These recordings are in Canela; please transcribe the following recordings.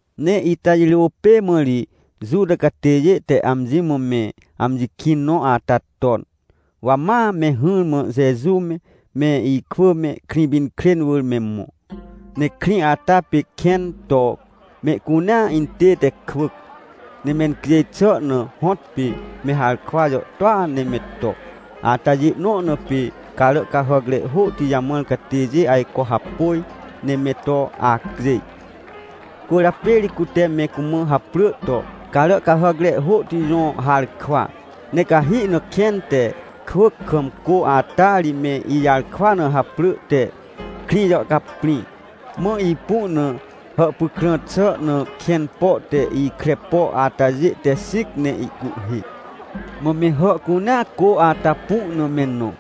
Ne ita jirô pê mã ri Juta catêjê te amji mã me amji kĩn nõ ata ton, wa ma me hỹrmã Jeju me, me ikwỳ me, Krĩpinkrên wỳr me mõ. Ne krĩ ata pê kẽn to mehcunea intête kwỳc, ne mencjêj xà na hõtpê me harkwa jàhtôa ne me to. Atajê nõ na pê carà cahàcre hôhti jamãr catêjê ajco hapôj ne me to acjêj. Cwỳrjapê ri cute me cumã haprỳ to Caràcahàcre Hôhti Jõ Harkwa. Ne cahi na kẽn te kwỳc kam cô ata ri me ijarkwa na haprỳ te Krĩjàhcaprĩ. Mã ipu na hàhpykrã xà na kẽn po te ikre po atajê te xĩc ne ihcuhhê. Mã me hà cunea cô ata pu na me nõ,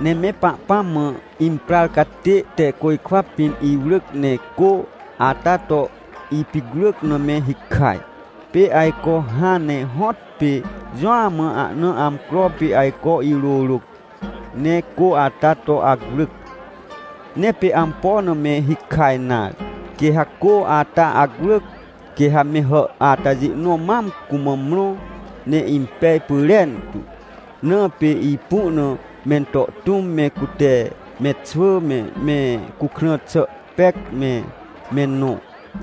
ne me Pahpãm mã imprar catê te côjkwa pĩn iwrỳc, ne cô ata to ipicwrỳc na me hikaj. Pê ajco hãn ne hõtpê jũa mã ahna amcro pê ajco irôrôc, ne cô ata to acwrỳc. Ne pê ampo na me hikaj nare. Quê ha cô ata acwrỳc, quê ha me hà atajê nõ mam cumã mrõ, ne impej pyrentu. Na pê ipu na mento tũm me, cute me xwỳ me, me cukrã xà pec me, me nõ.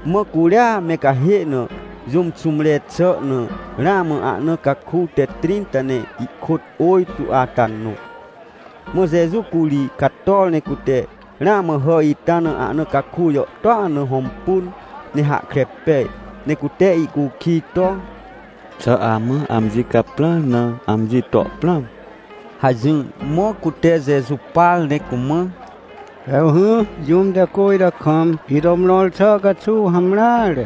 Mã curia me cahê na jũm xũmre xà na, ramã ahna caku te trĩnta ne ihkôt ôjtô ata nõ. Mã Jeju curi cator ne cute ramã hà ita na ahna caku jàhtôa na hõmpun, ne hahkre pej. Ne cute ihcukij to: — Xà amã amji caprãr na amji to prãm? — hajỹr. Mã cute Jeju par ne cumã: — Hewhỹ, jũm te cô ita kam ito mrõr xà caxuw hamreare.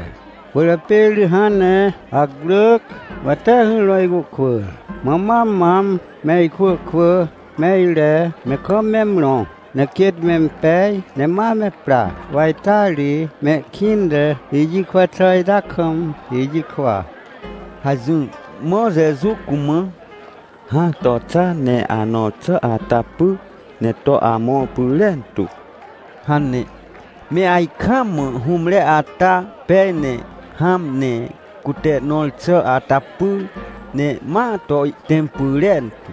Cwỳrjapê ri hãn ne acwrỳc, wa tee hỹrmã icuhkwỳr, mã ma mam me ikwỳ kwỳ me ire ne kam me mrõ. Ne quêt mempej ne ma me pra, wa ita ri mehkĩnte ijikwa xà ita kam ijikwa — hajỹr. Mã Jeju cumã: — Hã to xa, ne anõr xà ata py ne to amõr pyrentu — hane. Me ajkaam mã hũmre ata pej ne hãm, ne cute nõr xà ata pyr ne ma to ihtẽm pyrentu.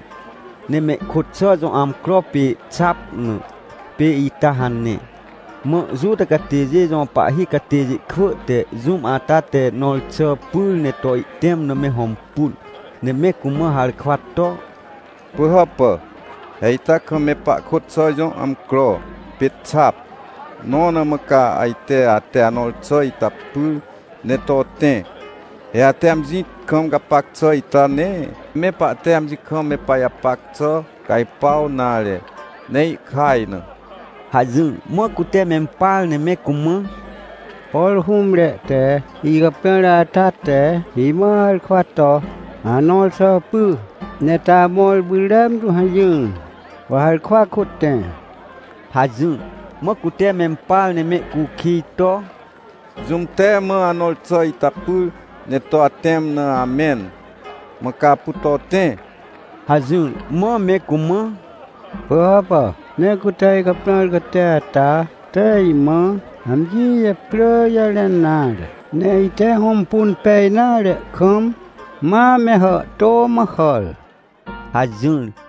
Ne mehkôt xà jõ amcro pê xap na, pê ita hane. Mã Juta catêjê jõ pahhi catêjê kwỳ te jũm ata te nõr xà pyr ne to ihtẽm na me hõmpun, ne me cumã harkwa to: — Pỳhàpà, he ita kam me pahkôt xà jõ amcro pê xap, nõ na mã ca ajte ate anõr xà ita pyr ne to tẽ? He ate amji kam gapac xà ita nee me pahte amji kam me pajapac xà cajpuaw nare, ne ihkaj na! — hajỹr. Mã cute mempar ne me cumã: — Por hũmre te icaprãr ata te imã harkwa to: “Anõr xà py ne to amõr pyrentu” hajỹr. Wa harkwa kôt tẽ — hajỹr. Mã cute mempar ne mehcukij to: — Jũm te mã anõr xà ita pyr ne to atẽm na amẽn, mã ca apu to tẽ? — hajỹr. Mã me cumã: — Pỳhàpà, nee cute icaprãr catê ata te imã amji japrỳ jarẽn nare, ne ite hõmpun pej nare kam, ma me hàhtô mã hàr — hajỹr.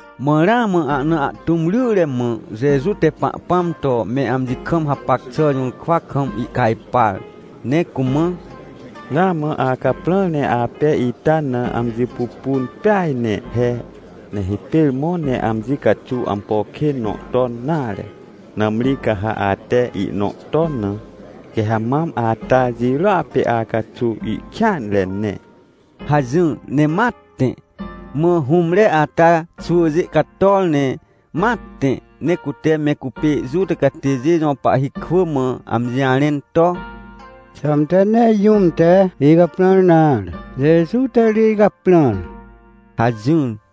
Mã ramã ahna ahtũm ryre mã Jeju te Pahpãm to me amji kam hapac xà jũrkwa kam ihcajpar ne cumã: — Ramã acaprãr ne apej ita na amji pupun peaj ne he. Ne hipêr mõ ne amji caxuw ampo kên nõ ton nare. Nãmri ca ha ate ihnõ ton na, quê ha mam ata jirôa pê acaxuw ihkêanre ne — hajỹr, ne ma tẽ. Mã hũmre ata xwỳjê cator ne ma tẽ, ne cute me cupê Juta catêjê jõ pahhi kwỳ mã amji jarẽn to: — Xãmte nee jũm te icaprãr nare, Jeju te ri icaprãr — hajỹr.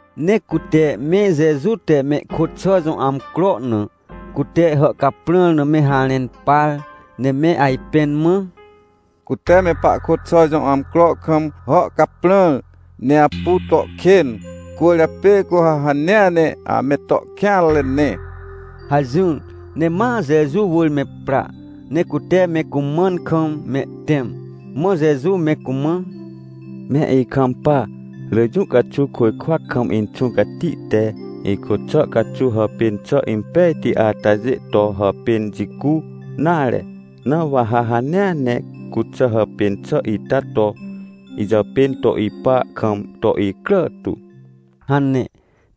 Ne cute me Jeju te mehkôt xà jõ amcro na, cute hàhcaprãr na me harẽn par ne me ajpẽn mã: — Cute me pahkôt xà jõ amcro kam hàhcaprãr, ne apu to kên, cwỳrjapê cu ha hanea ne ame to kêanre ne — hajỹr. Ne ma Jeju wỳr me pra, ne cute me cumãn kam mehtẽm. Mã Jeju me cumã: — Me ikampa, rỳ jũ caxuw côjkwa kam Inxũ Cati te ihkôt xà caxuw hàpên xà impejti atajê to hàpên jicu nare. Na wa ha hanea ne cuxà hàpên xà ita to ijàpên to ipa kam to icrà tu — hane.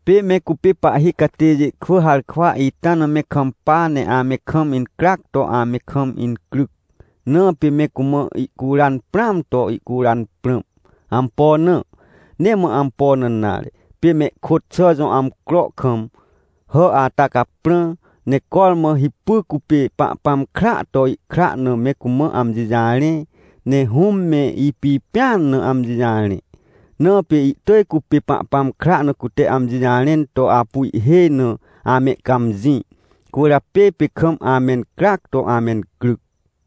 Pê me cupê pahhi catêjê kwỳ harkwa ita na me kampa ne ame kam incryac to ame kam incryc, na pê me cumã ihcuran prãam to ihcuran prãm. Ampo na? Nee mã ampo na nare, pê mehkôt xà jõ amcro kam hà ata caprã, ne cormã hipy cupê Pahpãm kraa to ihkra na me cumã amji jarẽ, ne Hũm me ipipẽan na amji jarẽ. Na pê ihtỳj cupê Pahpãm kra na cute amji jarẽn to apu ihhêj na amehcãmjĩ, cwỳrjapê pê kam amencryac to amencryc.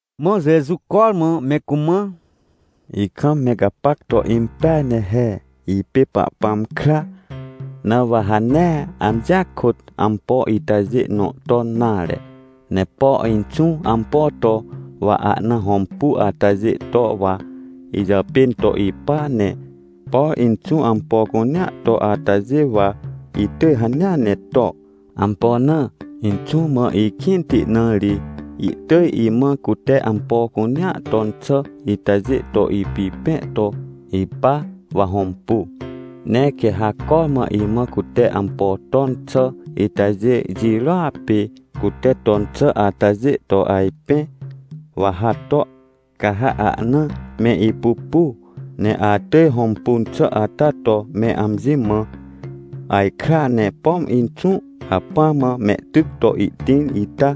Mã Jeju cormã me cumã: — Ikam me gapac to impeaj ne he. Ipê Pahpãm kra, na wa ha nee amjia kôt ampo itajê nõ ton nare. Ne por Inxũ ampo to, wa ahna hõmpu atajêa to wa ijàpên to ipa. Ne por Inxũ ampo cunea to atajê, wa itỳj hanea ne to. Ampo na? Inxũ mã ikĩnti, na ri ihtỳj imã cute ampo cunea ton xà itajê to ipipẽ to ipa, wa hõmpu. Ne quê ha cormã imã cute ampo ton xà itajê jirôa pê cute ton xà atajê to ajpẽ, wa ha to, ca ha ahna me ipupu. Ne atỳj hõmpun xà ata to me amji mã ajkra. Ne pom Inxũ hacpỹa mã mehtyc to ihtĩr, ita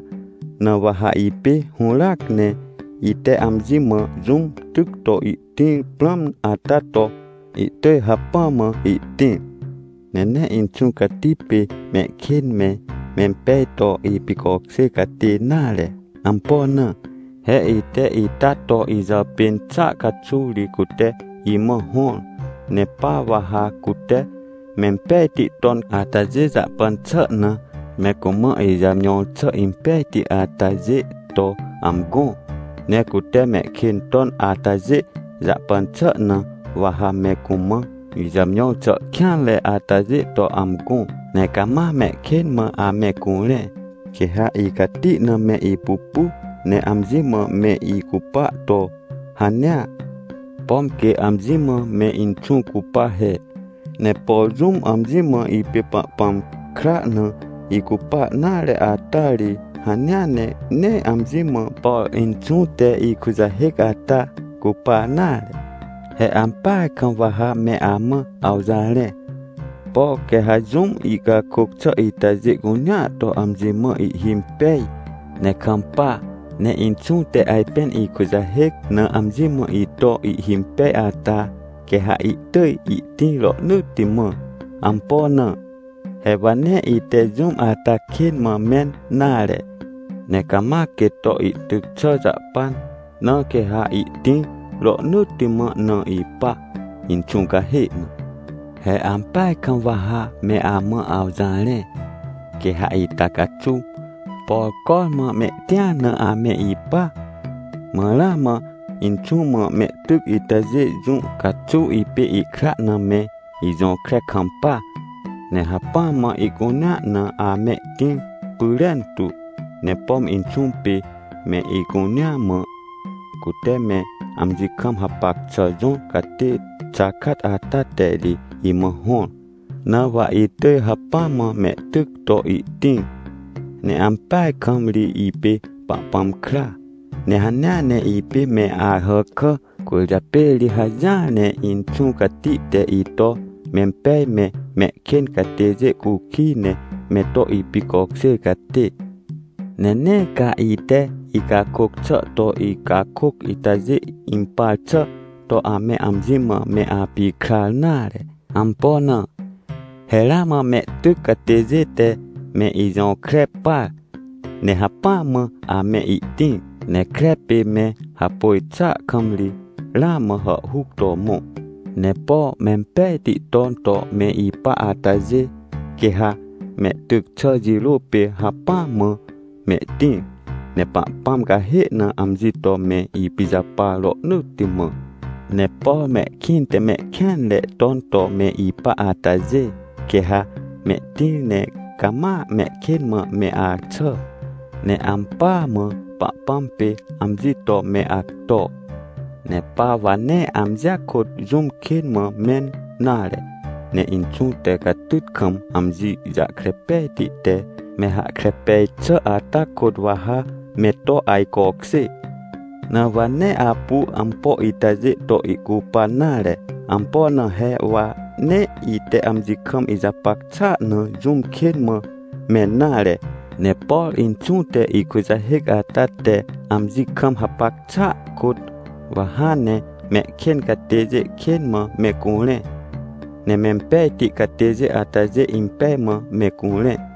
na wa ha ipê hũràac ne ite amji mã jũm tyc to ihtĩr prãm ata to, itỳj hacpỹ mã ihtĩr. Ne nee Inxũ Cati pê mehkên me, mempej to ipicokjêr catê nare. Ampo na? He ite ita to ijàpên xàa caxuw ri cute imã hõr. Ne pa wa ha cute mempejti ton atajê jahpan xà na, me cumã ijàmjõr xà impejti atajê to amgõ. Ne cute mehkên ton atajê jahpan xà na, wa ha me cumã ijàmjõr xà kêanre atajê to amgõ, ne cama mehkên mã ame curẽ. Quê ha icati na me ipupu, ne amji mã me icupa to hanea, pom quê amji mã me Inxũ cupa he. Ne por jũm amji mã ipê Pahpãm kra na icupa nare ata ri, hanea ne nee amji mã, por Inxũ te ikujahêc ata cupa nare. — He ampeaj kam wa ha me amã awjarẽ. Por quê ha jũm icakôc xà itajê cunea to amji mã ihhimpej ne kampa, ne Inxũ te ajpên ikujahêc na amji mã ito ihhimpej ata, quê ha ihtỳj ihtĩr rohnỳtti mã. Ampo na? He wa nee ite jũm ata kên mã mẽn nare, ne cama quêt to ihtyc xà jahpan, na quê ha ihtĩr rohnỳtti mã na ipa, Inxũ cahê na. He ampeaj kam wa ha me amã awjarẽ. Quê ha ita caxuw, por cormã mehtĩar na ame ipa, mã ramã Inxũ mã mehtyc itajê, jũ caxuw ipê ihkra na me ijõkre kampa, ne hacpỹ mã ihcunea na amehtĩr pyrentu. Ne pom Inxũ pê mehcunea mã, cute me amji kam hapac xà jõr catê xakat ata te ri imã hõr. Na wa itỳj hacpỹ mã mehtyc to ihtĩr. Ne ampeaj kam ri ipê Pahpãm kra, ne hanea ne ipê me Ahàkà, cwỳrjapê ri hajỹar ne Inxũ Cati te ito mempej me, mehkên catêjê cukij ne me to ipicokjêr catê. — Ne nee ca ite icakôc xà to icakôc itajê impar xà to ame amji mã me apikrar nare. Ampo na? He ramã amehtyc catêjê te me ijõkre par, ne hacpỹa mã amehtĩr ne kre pê me hapôj xàa kam ri ramã hàhhuc to mõ. Ne por mempejti ton to me ipa atajê, quê ha mehtyc xà jirô pê hacpỹa mã mehtĩr, ne Pahpãm cahê na amji to me ipijapar rohnỳtti mã. Ne por mehkĩnte mehkêanre ton to me ipa atajê, quê ha mehtĩr, ne cama mehkên mã me axà, ne ampỳa mã, Pahpãm pê amji to me acto. — Ne pa wa nee amjia kôt jũm kên mã mẽn nare, ne Inxũ te catyt kam amji jahkre pejti te me hahkre pej xà ata kôt, wa ha me to ajcokjê. Na wa nee apu ampo itajê to ihcupan nare. Ampo na? He wa nee ite amji kam ijapac xàa na jũm kên mã mẽn nare. Ne por Inxũ te ikujahêc ata te amji kam hapac xàa kôt wa hãn ne mehkên catêjê kên mã me curẽ, ne mempejti catêjê atajê impej mã me curẽ.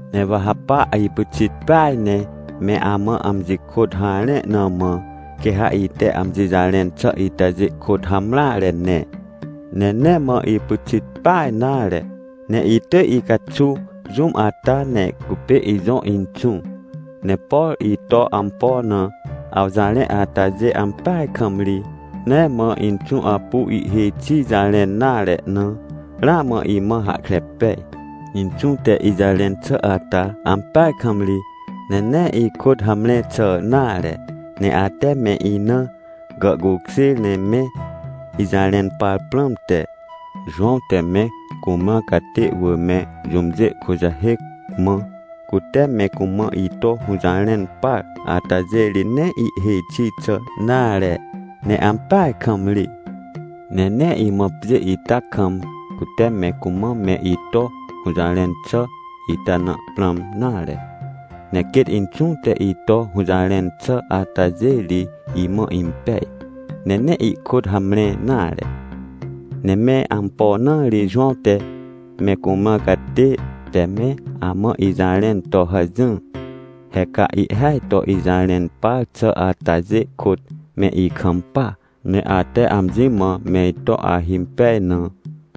— Ne wa ha pa ipyxit peaj ne me amã amji kôt harẽ na mã, quê ha ite amji jarẽn xà itajê kôt hamreare ne. Ne nee mã ipyxit peaj nare, ne ihtỳj icaxuw jũm ata, ne cupê ijõ Inxũ. Ne por ito ampo na awjarẽ atajê, ampeaj kam ri, nee mã Inxũ apu ihhêj xi jarẽn nare na, ramã imã hahkre pej. Inxũ te ijarẽn xà ata ampeaj kam ri, ne nee ihkôt hamre xà nare. — Ne ate me ina gàhcukjêr ne me ijarẽn par prãmte, Jowãw te me cumrãr catê wỳr me jũmjê kujahêc, mã cute me cumã ito hũjarẽn par atajê ri nee ihhêj xi xà nare, ne ampeaj kam ri. Ne nee imã pjê ita kam, cute me cumã me ito hũjarẽn xà ita na prãm nare, ne quêt Inxũ te ito hũjarẽn xà atajê ri imã impej, ne nee ihkôt hamre nare. Ne mẽr ampo na ri Jowãw te me cumrãr catê te me amã ijarẽn to hajỹr? He ca ihhêaj to ijarẽn par xà atajê kôt me ikampa, ne ate amji mã meito ahimpej na,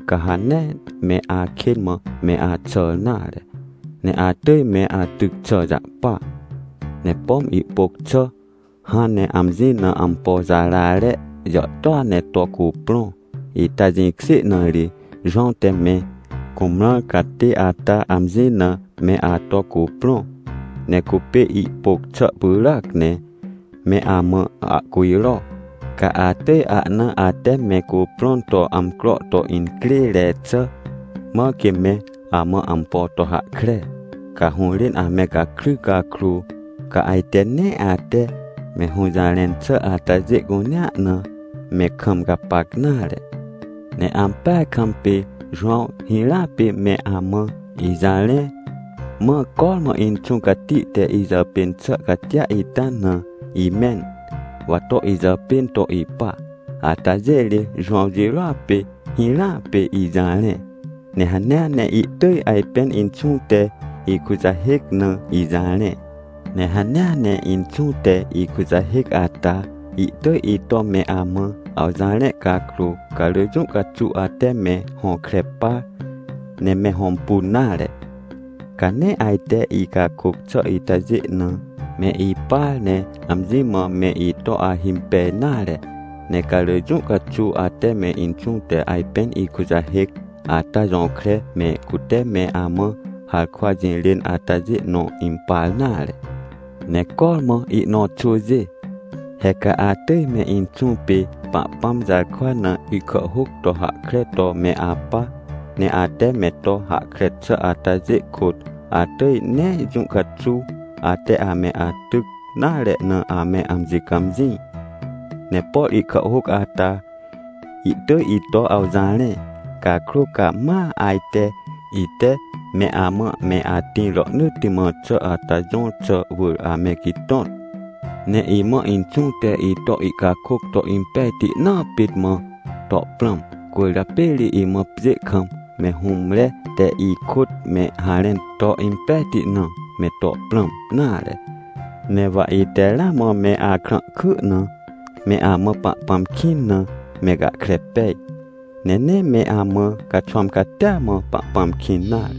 ca ha nee me akên mã me axàr nare, ne atỳj me atyc xà jahpa. — Ne pom ihpôc xà hãn ne amji na ampo jarare jàhtôa ne to cuprõ, ita jĩkjê na ri Jowãw te me cumrãr catê ata amji na me ato cuprõ. Ne cupê ihpôc xà pyràac ne me amã ahcujro, ca atỳj ahna ate me cuprõn to amcro to incrêre xà, mãr quê me amã ampo to hahkre. Ca hũrên ame gakry cakrô, ca ajte nee ate me hũjarẽn xà atajê cunea na me kam gapac nare. Ne ampeaj kam pê Jowãw hirãa pê me amã ijarẽ. Mã cormã Inxũ Cati te ijàpên xà catia ita na imẽn, wa to ijàpên to ipa, atajê ri Jowãw jirôa pê, hirãa pê ijarẽ, ne hanea ne ihtỳj ajpên Inxũ te ikujahêc na ijarẽ. Ne hanea ne Inxũ te ikujahêc ata, ihtỳj ito me amã awjarẽ cakrô, ca rỳ jũ caxuw ate me hõkre par ne me hõmpun nare. Ca nee ajte icakôc xà itajê na me ipar, ne amji mã me ito ahimpej nare. Ne ca rỳ jũ caxuw ate me Inxũ te ajpên ikujahêc ata jõkre me, cute me amã harkwa jirên atajê nõ impar nare. Ne cormã ihnõ xwỳjê, he ca atỳj me Inxũ pê Pahpãm jarkwa na ihkàhhôc to hahkre to me apa. Ne ate me to hahkre xà atajê kôt atỳj nee jũ caxuw ate ame atyc nare na, ame amji cãmjĩ. Ne por ihkàhhôc ata ihtỳj ito awjarẽ. Cakrô ca ma ajte ite me amã me atĩr rohnỳtti mã xà ata jõr xà wỳr ame gitõt. — Ne imã Inxũ te ito ihcakôc to impejti naa pit mã to prãm. Cwỳrjapê ri imã pjê kam me hũmre te ikôt me harẽn to impejti na me to prãm nare. Ne wa ite ramã me akrãhky na me amã Pahpãm kĩn na me gahkre pej, ne nee me amã caxwãm catia mã Pahpãm kĩn nare.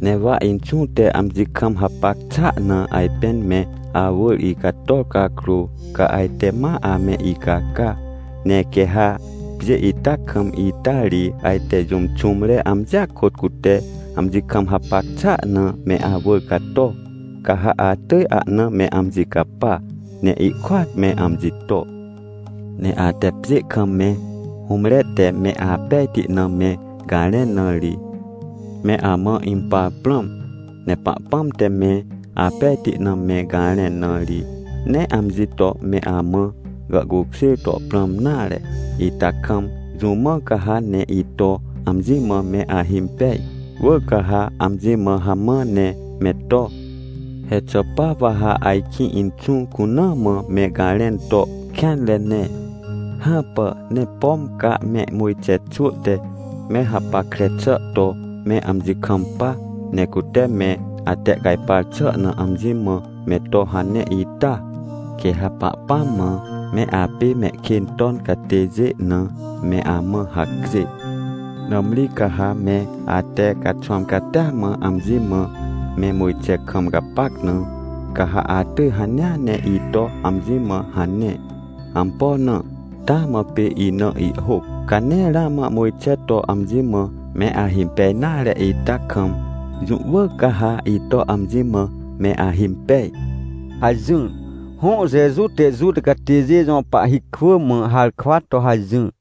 Ne wa Inxũ te amji kam hapac xàa na ajpên me awỳr icator cakrô, ca ajte ma ame icaca. Ne quê ha pjê ita kam, ita ri, ajte jũm xũmre amjia kôt cute amji kam hapac xàa na me awỳr cato, ca ha atỳj ahna me amji capa, ne ihkôat me amji to. Ne ate pjê kam me hũmre te me apejti na me garẽn na ri, me amã impar prãm. Ne Pahpãm te me apejti na me garẽn na ri, nee amji to me amã gàhcukjêr to prãm nare, ita kam jũ mã ca ha ne ito amji mã me ahimpej? Wỳr ca ha amji mã hamã ne me to. — He xà pa wa ha ajkĩ Inxũ cuna mã me garẽn to kêanre ne? Hãpà. Ne pom ca me Mojxe xwỳ te me hapackre xà to me amji kampa, ne cute me atehcajpar xà na amji mã me to hane ita, quê ha Pahpãm mã me apê mehkên ton catêjê na me amã hacjê. Nãmri ca ha me ate caxwãm catia mã amji mã me Mojxe kam gapac na, ca ha atỳj hanea ne ito amji mã hane. Ampo na? Taa mã pê ina ihhôc. Ca nee ramã Mojxe to amji mã me ahimpej nare ita kam, jũ wỳr ca ha ito amji mã me ahimpej — hajỹr. Hõ, Jeju te Juta catêjê jõ pahhi kwỳ mã harkwa to hajỹr.